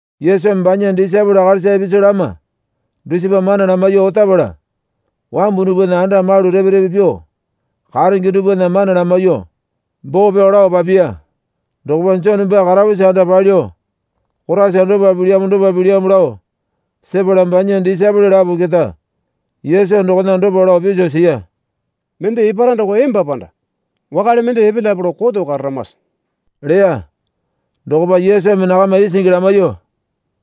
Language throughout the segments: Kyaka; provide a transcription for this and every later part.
Yesumi banya disaepole akalisa ipisu lama dusipa mana lamaiyuo otapala wambu dupwana anda malu repe repe pyuo karenge dupwana mana lamaiyuo boo pyao lao papiya. Dokopa Jone baa karapusi anda palyuo Koraisa dopa pilyamo dopa pilyamo lao sepala banya disaepole lapo keta Yesu dokona dopa lao piso siya. Mende epara doko emba panda wakale mende epelyape lao koto kararamase? leya. Dokopa Yesumi nakama isingi lamaiyuo,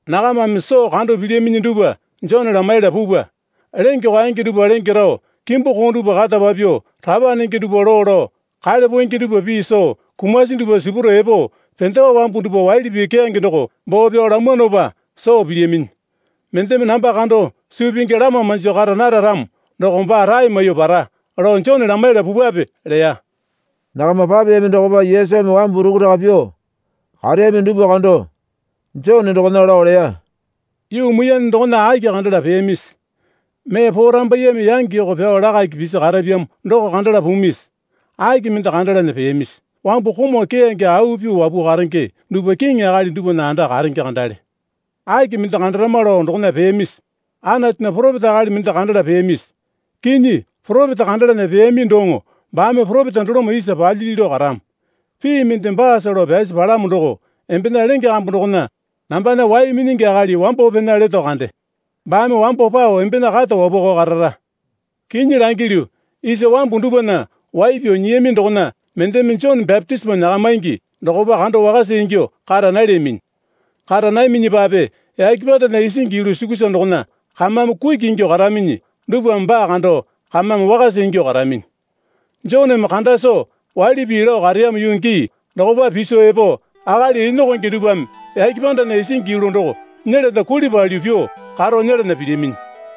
Nakamame soo kando pilyaminyi dupwa Jone lamaiyala pupwa. Lenge kwaenge dupwa lenge rao, kimbu koo dupwa kata papyuo, rapa nenge dupwa loo lao, kale poenge dupwa pii soo, kumasi dupwa sipurao epo, pendewa wambu dupwa waili pii keyange doko boo pyao lamwanopa soo pilyaminyi. Mendeme namba kando suu pingi lama manjo kara nara ramo doko baa rae maiyuo para lao Jone lamaiyala pupwape leya. Nakama papeyami dokopa Yesumi wambu rukuraka pyuo kareyami dupwa kando, Jone dokona lao leya, Yuu muiyane dokona aki kandala peyamisi? Mee porambaiyeme yangi yoko pyao lakaki pisi karapyamo doko kandala pumisi? Aki mende kandalana peyamisi? Wambu komau keyange au pyuo wapuo karenge dupwa kiŋi akali dupwana anda karenge kandale. Aki mende kandarama lao dokona peyamisi? Anatunya poropeta akali mende kandala peyamisi? Kinyi, poropeta kandalana peyami doŋo baame poropeta doloma isa palyili lao karamo. Pii mende baasa lao pyasi palamo doko, Embena lenge kambu dokona nambana wai minyingi akali wambo pena leto, kande. Baame wambo pao embena kata wapwakao karara. Kinyi langilyu isa wambu dupwana wai pyao nyiyami dokona mendeme Jone bapitisimo nyakamaingi dokopa kando wakasa ingyuo kara nalyaminyi. Kara nayaminyipape yake pandana isingi yulu sukusa dokona kamame kuki ingyuo karaminyi dupwame baa kando kamame wakasa ingyuo karaminyi. Joneme kanda soo waili pii lao kareyamo yuu gii dokopa piso epo akali enokonge dupwame yake pandana isingi yulu doko nyelana kuli palyuo pyuo karo nyelana pilyaminyi.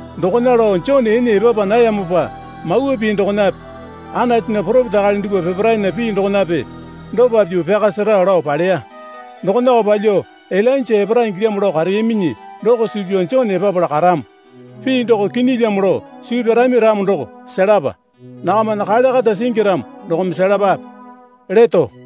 Dokona lao Jone ene epapa nayamopa Mawa Pii dokonape Anatunya poropeta akali dupwa peparaena pii dokonape dopa pyuo pyaka sera lao paleya. Dokonako palyuo Ilainja epara ingilyamo lao kareyaminyi doko suu pyao Jone epapala karamo. Pii doko kinyilyamo lao suu pyarami ramo doko selapa. Nakamana kale kata singi ramo dokome selapape leto.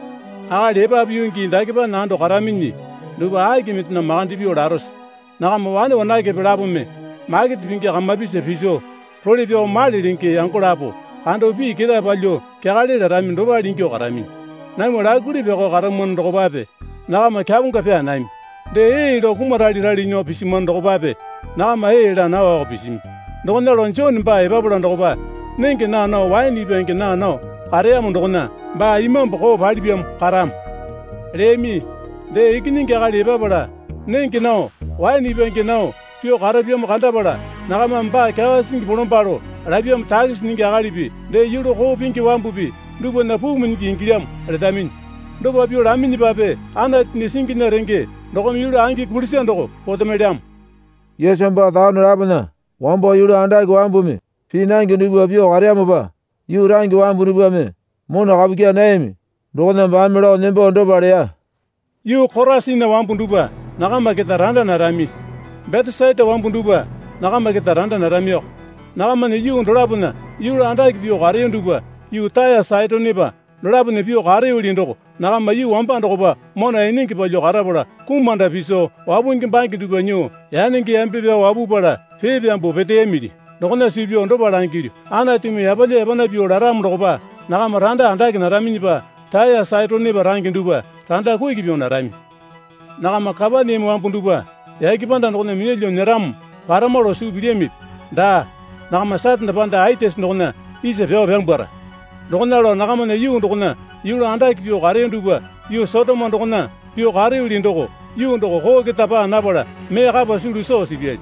Akali epapu yuu gii dakepana ando karaminyi dupwa aki mendena makande pyuo larose? Nakama wane wanakepe lapome makete pingi kamapisa piso role pyao male lenge yango lapo kando pii ketae palyuo kyakale larami dopale ingyuo karaminyi. Namwa laikuli pyakao karamwano dokopape nakama kyaponga pyaa nami. Dee ee lao kumaralerale nyuo pisimwano dokopape nakama ee laa nawako pisimi. Dokona lao Jone baa epapala dokopa nenge naa nao waene ipwange naa nao kareyamo dokona, baa imambu koo palipyamo karamo, leyami. Dee Ikinyingi Akali epapala nenge nao waene ipwange nao pyuo karapyamo kandapala nakamame baa kyawa sisingi bolombalo lapyamopa takisi nyingi akalipi dee yulu koo pingi wambupi dupwana puu minyingi ingilyamo, letaminyi. Dopa pyuo laminyipape Anatunya singinya renge dokome yulu angi kulisa doko potemelyamo. Yesu baa taone lapona wambo yulu andake wambumi pii nange dupwa pyuo kareyamopa yuu range wambu dupwame mona kapu kyaa nayami dokona baame lao nembo dopa leya. Yuu Korasina wambu dupwa, nakama keta randa narami. Betesaita wambu dupwa, nakama keta randa naramiko. Nakamana yuu dolapona yulu andake pyuo kareyo dupwa yuu Taya Saitonepa dolapona pyuo kareyoli doko nakama yuu wamba dokopa mona enenge palyuo karapala kumanda piso wapungi bange dupwa nyuo yanenge yambe pyao wapupala pee pyambuo peteyamuli. Dokona suu pyao dopa langilyu, Anatumi yapalya yapana pyuo laramo dokopa nakama randa andake naraminyipa Taya Saitonepa range dupwa randa kuki pyuo narami. Nakama Kapaneame wambu dupwa yake panda dokona minyalyuo nyeramo parama lao suu pilyamipi? Daa, nakama Satane panda Aitisi dokona isa pyao pyambwara. Dokona lao nakamana yuu dokona yulu andake pyuo kareyo dupwa yuu Sotoma dokona pyuo kareyoli doko yuu doko koo keta paa napala mee kapa sulu soo sipyali.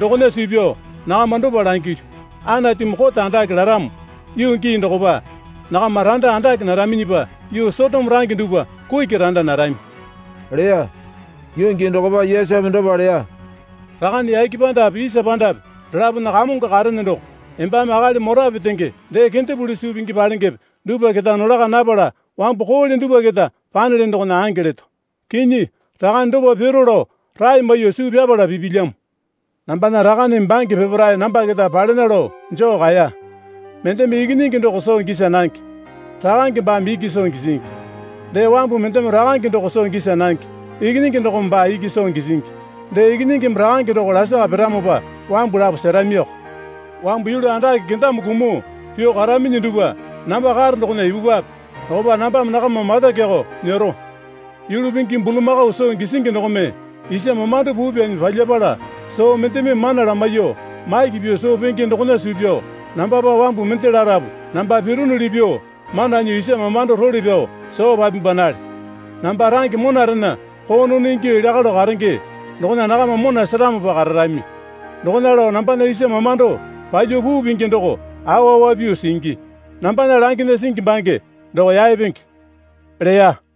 Dokona suu pyao nakama dopa langilyu. Anatumi kote andake laramo yuu gii dokopa nakama randa andake naraminyipa yuu Sotoma range dupwa kuki randa narami, leya. Yuu gii dokopa Yesumi dopa leya, Rakane yake pandape isa pandape dolapona Kamongo karene doko embame akali mora petenge dee kendepuli suu pingi palengepe dupwa keta nolaka napala wambu koole dupwa keta panelene dokona ange leto. Kinyi, Rakane dopa piro lao rae maiyuo suu pyapala pipilyamo. Nambana Rakaneme bange peparae namba keta palena lao joo kaeya. Mendeme Ikinyingi doko soo gisa nange, Rakange baame iki soo gisingi. Dee wambu mendeme Rakange doko soo gisa nange, Ikinyingi dokome baa iki soo gisingi. Dee Ikinyingimi Rakange doko lasaka piramopa wambu lapo seramioko. Wambu yulu andake kendame kumuo pyuo karaminyi dupwa namba karo dokona ipupwape. Dokopa nambame nakama mata kyakao nyero. Yulu pingi bulamakao soo gisingi dokome isa mamando puu pyanyi palyapala soo mendeme mana lamaiyuo maki pyuo soo penge dokona suu pyao nambapa wambu mende larapu namba pironuli pyuo mana nyuo isa mamando role pyao soo papimbanale. Namba range monarena koonono ingyuo elya kalo karenge dokona nakama mona seramopa kararami. Dokona lao nambana isa mamando palyuo puu pingi doko awa awa pyuo singi, nambana langena singi bange doko yaepenge, leya.